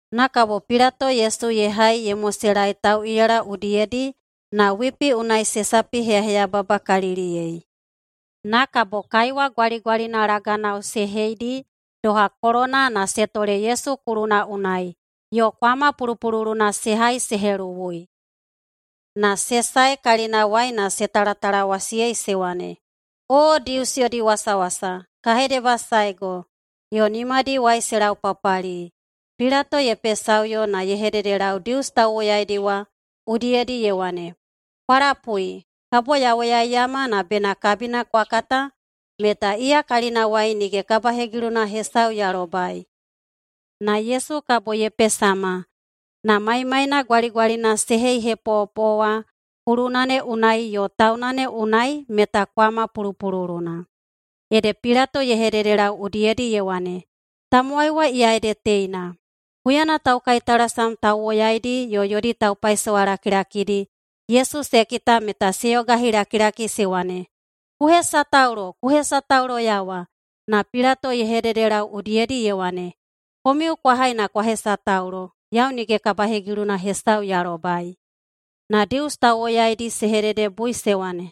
Na kabo Pilato Yesu ye hai ye moselaei tauꞌiyala udiyedi na wipi unai se sapiheyababakaliliyei. Na kabo kaiwa gwaligwalina laganao se heidi doha kolona na se tole Yesu kuluna unai, yo kwama pulupululuna se hai se heluwui. Na se sae kalinawai na se talatalawasiyei se wane, “O Dius yodi wasawasa, ka hedebasaego.” Yo nimadiwai se laupapali. Pilato ye pesaꞌuyo na ye hededelau Dius tauwoyaidi wa udiyedi ye wane, “Kwa lapui, kabo ya woyaiyama na bena kabina kwa kata meta iya kalinawai nige kabahegiluna hesau ya lobai.” Na Yesu kabo ye pesama, na maimaina gwaligwalina se heihepoꞌopoꞌo wa kuluna ne unai yo tauna ne unai meta kwama pulupululuna. Ede Pilato ye hededelau udiyedi ye wane, “Tamowai wa iya ede teina!” Huyana taukaitalasam tauwoyaidi yo yodi taupaisowa lakilakidi Yesu se kita meta se yogahilakilaki se wane, “Ku hesataulo! Ku hesatauloyawa!” Na Pilato ye hededelau udiyedi ye wane, “Komiu kwa hai na kwa hesataulo. Yau nige kabahegiluna hesau ya lobai.” Na Dius tauwoyaidi se hededebui se wane,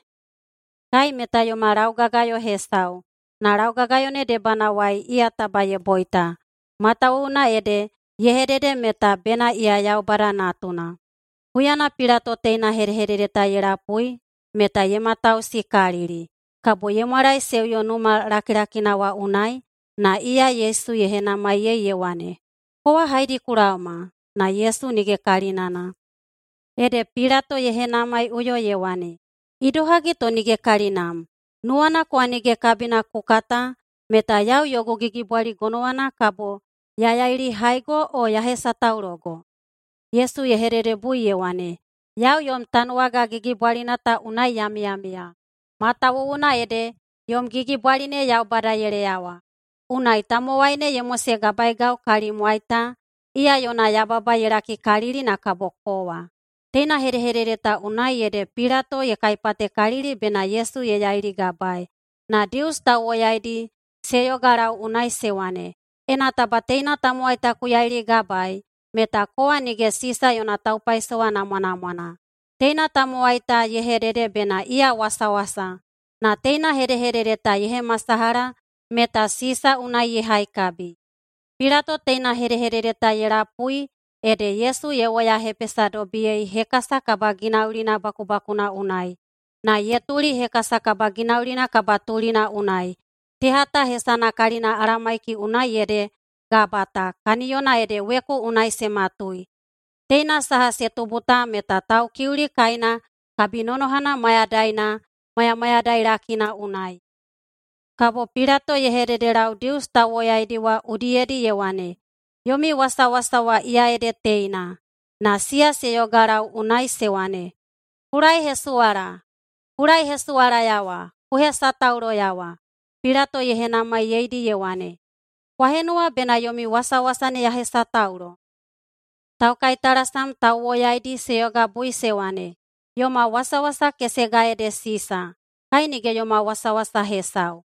“Kai meta yoma laugagayo hesau, na laugagayo ne debanawai iya taba ye boita, matawuwuna ede ye hedede meta bena iya Yaubada Natuna.” Huyana Pilato teina hedehedede ta ye lapui meta ye matausikalili. Kabo ye mwalaeseuyo numa lakilakina wa unai, na iya Yesu ye henamaiyei ye wane, “Kowa haedi ku laoma?” Na Yesu nige kalinana. Ede Pilato ye henamaiꞌuyo ye wane, “Idohagi to nige kalinam? Nuwana kowa nige kabina ku kata meta yau yogu gigibwali gonowana kabo ya yailihaigo o ya hesataulogo?” Yesu ye hededebui ye wane, “Yau yom tanuwaga gigibwalina ta unai ya miyamiya matawuwuna ede yom gigibwali ne Yaubada ye leyawa. Unai tamowai ne ye mosegabaeigau kalimwai ta, iya yona yababa ye lakikalili na kabo kowa.” Teina hedehedede ta unai ede Pilato ye kaipatekalili bena Yesu ye yailigabaei, na Dius tauwoyaidi se yogalau unai se wane, “Ena taba teina tamowai ta ku yailigabaei meta kowa nige Sisa yona taupaisowa namwanamwana. Teina tamowai ta ye hedede bena iya wasawasa, na teina hedehedede ta ye hemasalaha meta Sisa unai ye haikabi.” Pilato teina hedehedede ta ye lapui ede Yesu ye woyahepesadobiyei hekasa kabaginaulina bakubakuna unai, na ye tuli hekasa kabaginaulina kabatulina unai. Teha ta hesana kalina Alamaiki unai ede Gabata, kaniyona ede weku unai se matui. Teina saha se tubu ta meta Taukiuli kaina kabinonohana mayadaina mayamayadailakina unai. Kabo Pilato ye hededelau Dius tauwoyaidi wa udiyedi ye wane, “Yomi wasawasa wa iya ede teina.” Na siya se yogalau unai se wane, “Ku laehesuwala! Ku laehesuwalayawa! Ku hesatauloyawa!” Pilato ye henamaiyeidi ye wane, “Kwa henuwa bena yomi wasawasa ne ya hesataulo?” Taukaitalasam tauwoyaidi se yogabui se wane, “Yoma wasawasa kesega ede Sisa! Kai nige yoma wasawasa hesau!”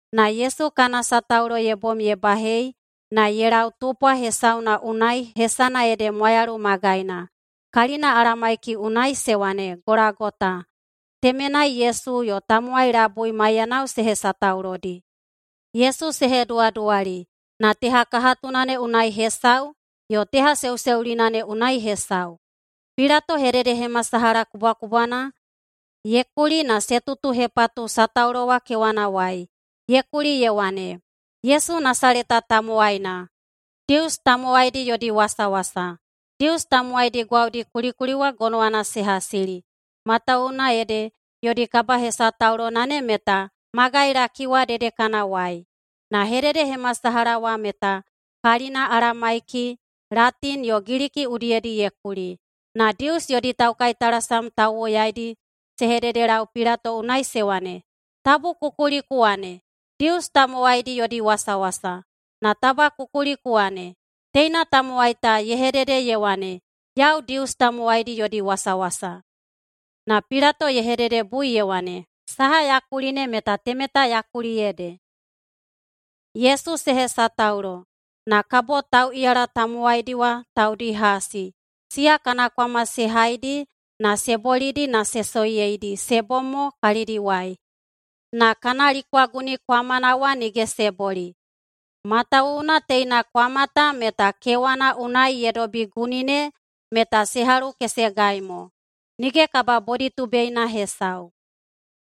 Na Yesu kana sataulo ye bom ye bahei na ye lau tupwa hesauna unai hesana ede Mwayalu Magaina. Kalina Alamaiki unai se wane, Golagota. Temenai Yesu yo tamowai labui maiyanao se hesataulodi. Yesu se heduwaduwali na tehakahatuna ne unai hesau yo tehaseuseulina ne unai hesau. Pilato hededehemasalaha kubwakubwana ye kuli na se tutuhepatu sataulo wa kewanawai. Ye kuli ye wane, “YESU NASALETA TAMOWAINA, DIUS YODI WASAWASA.” Dius tamowaidi gwaudi kulikuli wa gonowana se hasili, matawuwuna ede yodi kabahesataulona ne meta magailaki wa dedekanawai. Na hededehemasalaha wa meta kalina Alamaiki, Latini yo Giliki udiyedi ye kuli. Na Dius yodi taukaitalasam tauwoyaidi se hededelau Pilato unai se wane, “Tabu ku kuli ku wane, ‘Dius tamowaidi yodi wasawasa,’ na taba ku kuli ku wane, teina tamowai ta ye hedede ye wane, ‘Yau Dius tamowaidi yodi wasawasa.’” Na Pilato ye hededebui ye wane, “Saha ya kuli ne meta temeta ya kuli ede!” Yesu se hesataulo, na kabo tauꞌiyala tamowaidi wa taudi hasi, siya kana kwama se haidi na se bolidi na se soiyeidi se bom mo kalidiwai, na kana likwaguni kwamana wa nige se boli, matawuwuna teina kwama ta meta kewana unai ye dobi guni ne meta se halukesegai mo, nige kababoditubeina hesau.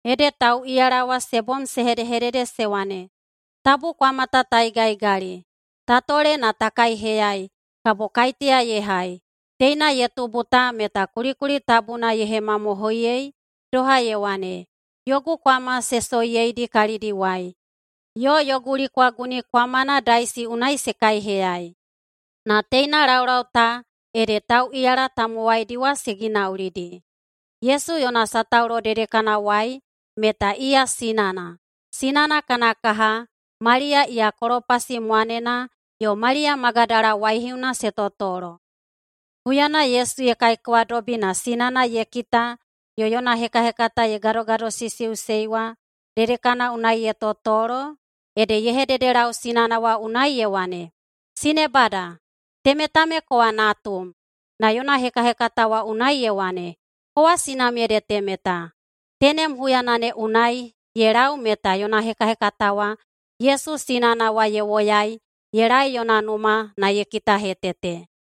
Ede tauꞌiyala wa se bom se hedehedede se wane, “Tabu kwama ta ta igaꞌigali. Ta tole na ta kaiheyai kabo kaiteya ye hai.” Teina ye tubu ta meta kulikuli tabuna ye hemamohoiyei doha ye wane, “Yogu kwama se soiyeidi kalidiwai, yo yogu likwaguni kwamana daisi unai se kaiheyai.” Na teina laulau ta ede tauꞌiyala tamowaidi wa se ginaulidi. Yesu yona sataulo dedekanawai meta iya sinana, sinana kana kaha, Maliya iya Kolopasi mwanena yo Maliya Magadala waihiuna se totolo. Huyana Yesu ye kaikewadobi na sinana ye kita yo yona hekahekata ye gadogadosisiꞌusei wa dedekana unai ye totolo, ede ye hededelau sinana wa unai ye wane, “Sinebada! Temeta me kowa natum.” Na yona hekahekata wa unai ye wane, “Kowa sinam ede temeta.” Tenem huyana ne unai ye lau meta yona hekahekata wa Yesu sinana wa ye woyai ye laei yona numa na ye kitahetete.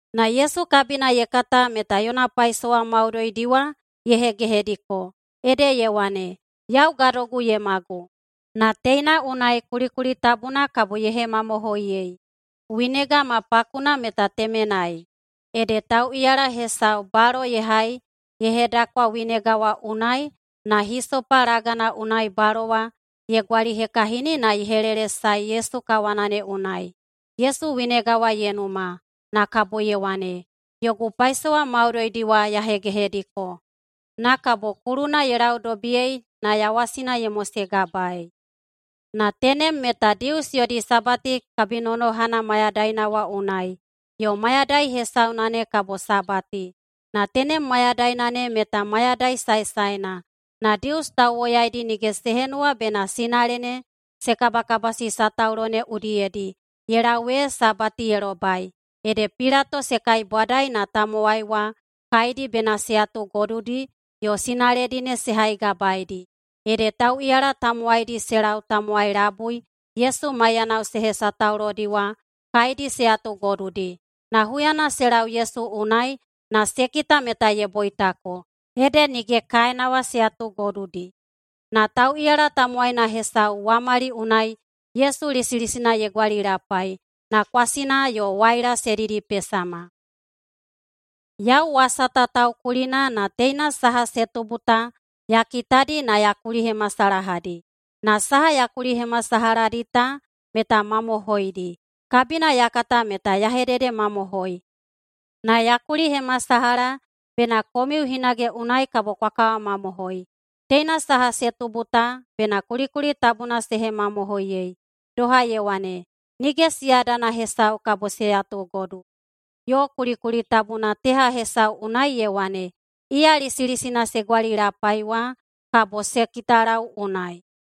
Na Yesu kabina ye kata meta yona paisowa maudoidi wa ye hegehediko. Ede ye wane, “Yau gadogu ye magu.” Na teina unai kulikuli tabuna kabo ye hemamohoiyei. Winega ma pakuna meta temenai, ede tauꞌiyala hesau balo ye hai ye hedakwa winega wa unai na hisopa lagana unai balo wa ye gwalihekahini na ye helelesae Yesu kawana ne unai. Yesu winega wa ye numa, na kabo ye wane, “Yogu paisowa maudoidi wa ya hegehediko.” Na kabo kuluna ye laudobiyei na yawasina ye mosegabaei. Na tenem meta Dius yodi Sabati kabinonohana mayadaina wa unai, yo mayadai hesauna ne kabo Sabati. Na tenem mayadaina ne meta mayadai saesaena. Na Dius tauwoyaidi nige se henuwa bena sinale ne se kabakabasi sataulo ne udiyedi ye lau ee Sabati ye lobai. Ede Pilato se kaibwadai na tamowai wa kaedi bena se yatugodudi yo sinaledi ne se haigabaeidi. Ede tauꞌiyala tamowaidi se lau tamowai labui Yesu maiyanao se hesataulodi wa kaedi se yatugodudi. Na huyana se lau Yesu unai na se kita meta ye boitako, ede nige kaena wa se yatugodudi. Na tauꞌiyala tamowaina hesau wamali unai Yesu lisilisina ye gwalilapai, na kwasina yo waila se didipesama. Yau wasa ta taukulina na teina saha se tubu ta ya kitadi na ya kulihemasalahadi. Na saha ya kulihemasalahadi ta meta mamohoidi. Kabina ya kata meta ya hededemamohoi. Na ya kulihemasalaha bena komiu hinage unai kabo kwa kawamamohoi. Teina saha se tubu ta bena kulikuli tabuna se hemamohoiyei, doha ye wane, “Nige siyadana hesau kabo se yatugodu.” Yo kulikuli tabuna teha hesau unai ye wane, “Iya lisilisina se gwalilapai wa, kabo se kitalau unai.”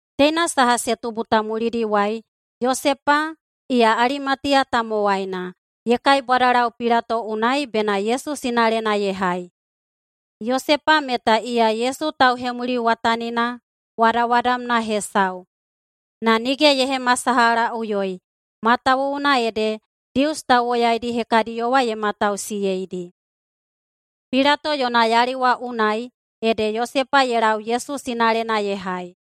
Teina saha se tubu ta mulidiwai, Yosepa, iya Alimatiya tamowaina, ye kaibwadalau Pilato unai bena Yesu sinalena ye hai. Yosepa meta iya Yesu tauhemuliwatanina wadawadamna hesau na nige ye hemasalahaꞌuyoi, matawuwuna ede Dius tauwoyaidi hekadiyo wa ye matausiyeidi. Pilato yona yali wa unai ede Yosepa ye lau Yesu sinalena ye hai,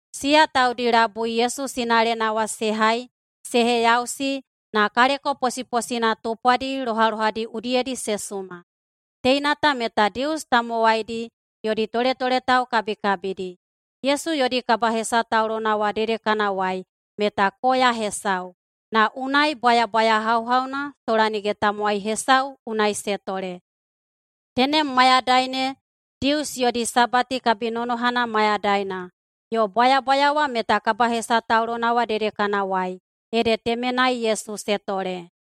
Siya taudi labui Yesu sinalena wa se hai se heyausi na kaleko posiposina tupwadi lohalohadi udiyedi se suma. Teina ta meta Dius tamowaidi yodi toletoletau kabikabidi. Yesu yodi kabahesataulona wa dedekanawai meta koya hesau, na unai bwayabwaya hauhauna sola nige tamowai hesau unai se tole. Tenem mayadai ne Dius yodi Sabati kabinonohana mayadaina yo bwayabwaya wa meta kabahesataulona wa dedekanawai, ede temenai Yesu se tole.